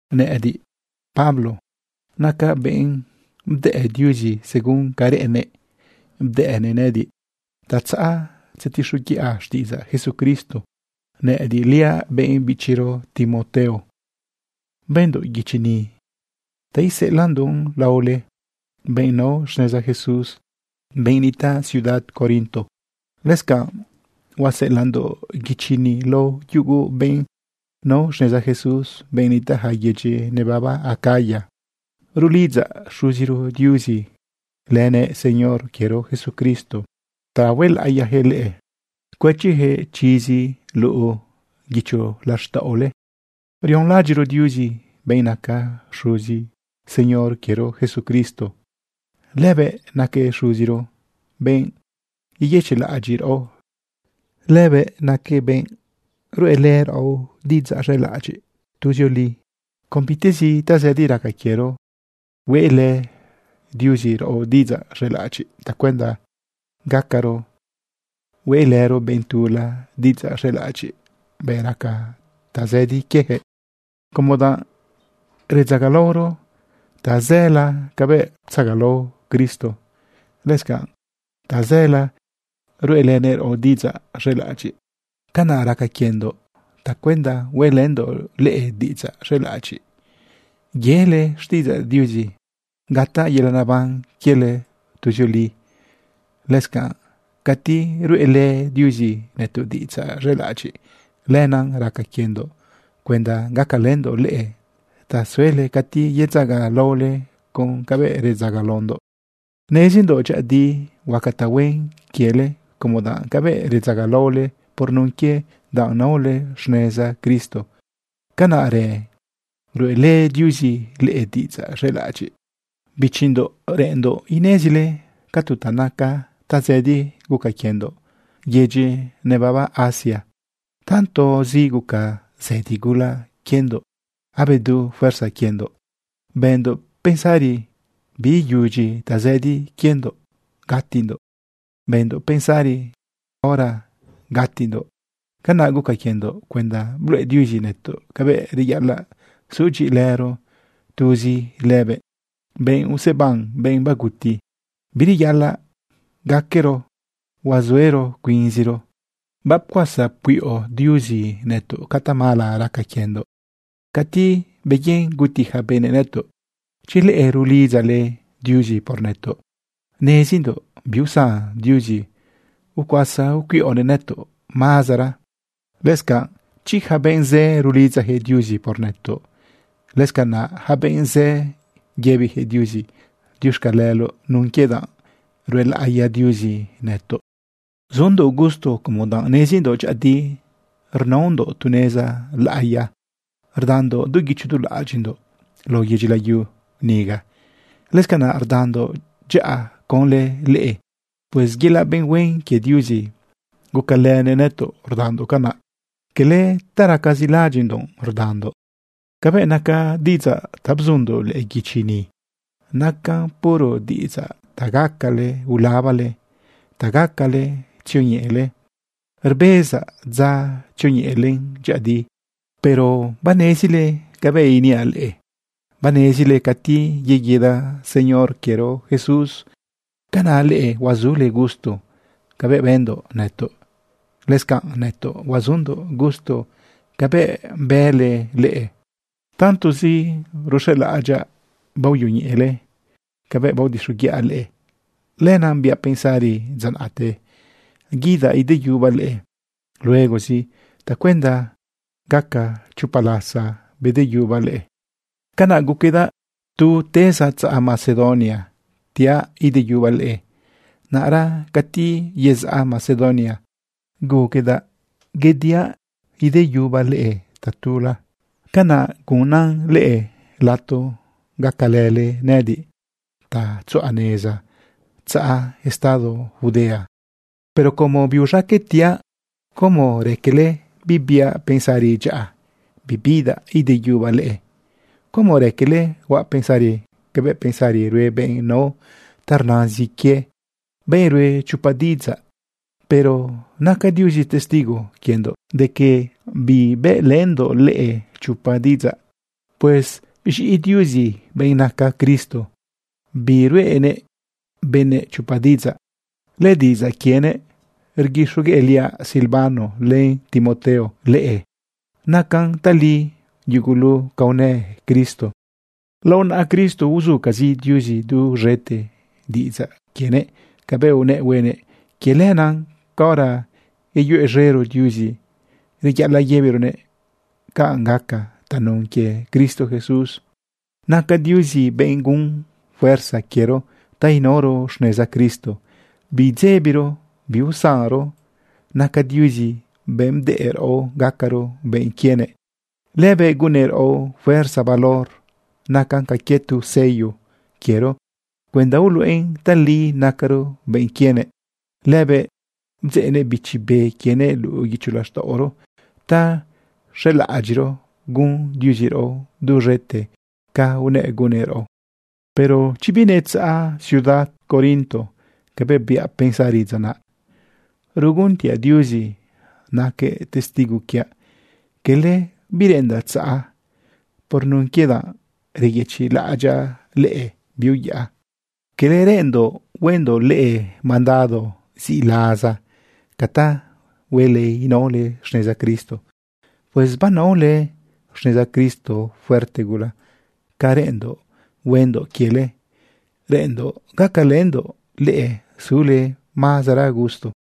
Nëꞌëdiꞌ, Pablo, nacaꞌ benꞌ bdëꞌ Diuzi. Según ca reꞌennëꞌ bdëꞌnëꞌ nëꞌëdiꞌ ta tzaꞌa tzetixoguiꞌa xtiꞌidzaꞌ Jesucristo. Nëꞌëdiꞌliaꞌ benꞌ bichiro Timoteo, bëndoꞌ guichi ni ta iseꞌelaꞌndoꞌn lao leꞌe, benꞌ nao xneza Jesús, benꞌ nitaꞌ ciudad Corinto. Lëscanꞌ huaseꞌelaꞌndoꞌ guichi ni lao yugu benꞌ nao xneza Jesús, benꞌ nitaꞌ yaca yedyi nebaba Acaya. Rulidzaꞌ Xuziro Diuzi lënëꞌ Señor quiero Jesucristo ta huelaꞌiyaquëꞌ leꞌe, cuëchiyaquëꞌ chizi luꞌu guicho laxtaꞌole. Rionlaꞌadyiꞌro Diuzi, benꞌ naca Xuzi Señor quiero Jesucristo. Lëbëꞌ naquëꞌ Xuziro, benꞌ yeyëchiꞌlaꞌadyiꞌ raꞌo. Lëbëꞌnaquëꞌ benꞌ ruꞌelë raꞌo diꞌidzaꞌ z̃elaꞌadyiꞌ tuzioli. Con bitezi tazëdi raca quiero, hueꞌlë Diuzi raꞌo diꞌidzaꞌ z̃elaꞌadyiꞌ tacuenda gacaro hueꞌ lërëro benꞌ tula diꞌ idzaꞌ z̃elaꞌadyiꞌ bëꞌ raca tazëdi quiejëꞌ. Como danꞌ redzagalaoro tazëla cabëꞌ ptzagalao Cristo, lëscanaꞌ tazëla ruꞌelënëꞌ raꞌo diꞌidzaꞌ z̃elaꞌadyiꞌ. Canaꞌ raca quiendoꞌ tacuenda hueꞌlëndoꞌ leꞌe diꞌidzaꞌ z̃elaꞌadyiꞌ yele xtiꞌidzaꞌ Diuzi gataꞌ yelaꞌ naban quiele tuzioli. Lëscanꞌ cati ruꞌelë Diuzi nëtoꞌ diꞌidzaꞌ z̃elaꞌadyiꞌ, lenaꞌ raca quiendoꞌ cuenda gacalëndoꞌ leꞌe ta suele cati yedzagalaole con cabëꞌ redzagalaondoꞌ. Nezindoꞌ dyëꞌëdi huaca tahuen quiele, como danꞌ cabëꞌ redzagalaole por nun quie danꞌ naole xneza Cristo, canaꞌrë ruꞌelë Diuzi leꞌe diꞌidzaꞌ z̃elaꞌadyiꞌ. Bichindoꞌ, reꞌenndoꞌ inezile ca tu naca tazëdi guca quiendoꞌ yaca yedyi nebaba Asia. Tantozi guca zëdi gula quiendoꞌ, abedu fuerza quiendoꞌ. Bëndoꞌ pensari biiyudyi tazëdi quiendoꞌ gatindoꞌ. Bëndoꞌ pensari hora gatindoꞌ. Canaꞌ guca quiendoꞌ cuenda bluꞌe Diuzi nëtoꞌ cabëꞌ reyaꞌalaꞌ sudyiꞌilëro tuzi lëbëꞌ, benꞌ useban benꞌ baguti. Bireyaꞌalaꞌ gaquero huazuero cuinziro. Bapcuasa pcuiꞌo Diuzi nëtoꞌ ca tamala raca quiendoꞌ cati beyen guti ja benëꞌ nëtoꞌ. Chi leꞌe rulidzale Diuzi por nëtoꞌ, nezindoꞌ biusan Diuzi ucuasa ucuiꞌonëꞌ nëtoꞌ mazara. Lëscanꞌ chi ja benꞌ zë rulidzajëꞌ Diuzi por nëtoꞌ, lëscanaꞌ ja benꞌ zë yëbijëꞌ Diuzi diuxcaleloꞌ nun quie danꞌ ruelaꞌiya Diuzi nëtoꞌ. Sundoꞌ gusto como danꞌ nezindoꞌ dyëꞌëdi rnaondoꞌ tu neza laꞌiya rdandoꞌ du guicho du laꞌadyiꞌndoꞌ lao yedyi layu niga. Lëscanaꞌ rdandoꞌ dyaꞌa conlë leꞌe. Pues yelaꞌ benꞌ huen quie Diuzi gucalënëꞌ nëtoꞌ rdandoꞌ canaꞌ, cala ta racazi laꞌadyiꞌndoꞌ rdandoꞌ. Cabëꞌ naca diꞌidzaꞌ ta bzundoꞌ lëꞌë guichi ni, nacan puro diꞌidzaꞌ ta gacale ulabale, ta gacale tzioñeꞌele. Rbezaꞌ dza tzioñeꞌelen dyëꞌëdi. Pero banezile cabëꞌ iniaꞌ leꞌe. Banezile cati yeguida Señor quiero Jesús, canaꞌ leꞌe huazule gusto cabëꞌ bëndoꞌ nëtoꞌ. Lëscanꞌ nëtoꞌ huazundoꞌ gusto cabëꞌ bële leꞌe. Tantozi ruxelaꞌadyaꞌ baoyoñeꞌele cabëꞌ baodixoguiꞌa leꞌe, lenaꞌ biaꞌ pensari dza naꞌte guidaꞌ ideyubaꞌ leꞌe luegozi tacuenda gaca chopa lasa bedeyubaꞌ leꞌe. Canaꞌ guquedaꞌ tu tezaꞌ tzaꞌ Macedonia tiaꞌ ideyubaꞌ leꞌe. Naꞌra cati yezaꞌ Macedonia guquedaꞌ yediaꞌ yeyubaꞌ leꞌe tatula. Canaꞌ gunan leꞌe lato gacalële nëꞌëdiꞌ ta tzuꞌa neza tzaꞌ estado Judea. Pero como biuz̃aqueꞌ tiaꞌ, ¿cómo raquele bibiaꞌ pensari dyaꞌa bibidaꞌ ideyubaꞌ leꞌe? ¿Cómo raquele huaꞌ pensari cabëꞌ pensari rue benꞌ nao ta rnazin quie, benꞌ ruꞌe chopa diꞌidzaꞌ? Pero naca Diuzi testigo quiendoꞌ de que bibëꞌlëndoꞌ leꞌe chopa diꞌidzaꞌ. Pues z̃iꞌi Diuzi, benꞌ naca Cristo, biruꞌenëꞌ benëꞌ chopa diꞌidzaꞌ. Lëdiꞌidzaꞌ quienëꞌ rguixogueꞌliaꞌ Silvano len Timoteo leꞌe. Nacan tali yugulu ca unë Cristo. Lao naꞌa Cristo uzucazi Diuzi duz̃ete diꞌidzaꞌ quienëꞌ cabëꞌ unëꞌ huenëꞌ. Quie lenaꞌ caora yeyuez̃ero Diuzi, reyaꞌalaꞌ yëbironëꞌ “canꞌ gaca” tanun quie Cristo Jesús. Naca Diuzi benꞌ gun fuerza quiero ta inaoro xneza Cristo biidzebiro biusanron. Naca Diuzi benꞌ bdëꞌ raꞌo gacaro benꞌ quienëꞌ. Lëbëꞌ gunnëꞌ raꞌo fuerza valor nacan ca quie tu sello quiero cuenda uluꞌen tali nacaro benꞌ quienëꞌ. Lëbëꞌ bdzeꞌnëꞌ Bichi Be quienëꞌ luꞌu guicho laxtaꞌoro ta xelaꞌadyiꞌro gun Diuzi raꞌo duz̃ete ca unëꞌ gunnëꞌ raꞌo. Pero chi binetzaꞌa ciudad Corinto cabëꞌ biaꞌ pensari dza naꞌ, rguntiaꞌ Diuzi naquëꞌ testigo quiaꞌ, cala bireꞌendaꞌ tzaꞌa. Por nun quie danꞌ reyëchiꞌlaꞌadyaꞌ leꞌe biuyaꞌa. Cala reꞌenndoꞌ huendoꞌ leꞌe mandado ziꞌlaza ca ta huele inaole xneza Cristo. Pues banaole xneza Cristo fuerte gula. Ca reꞌenndoꞌ huendoꞌ quiele, reꞌenndoꞌ gacalëndoꞌ leꞌe sule mazara gusto.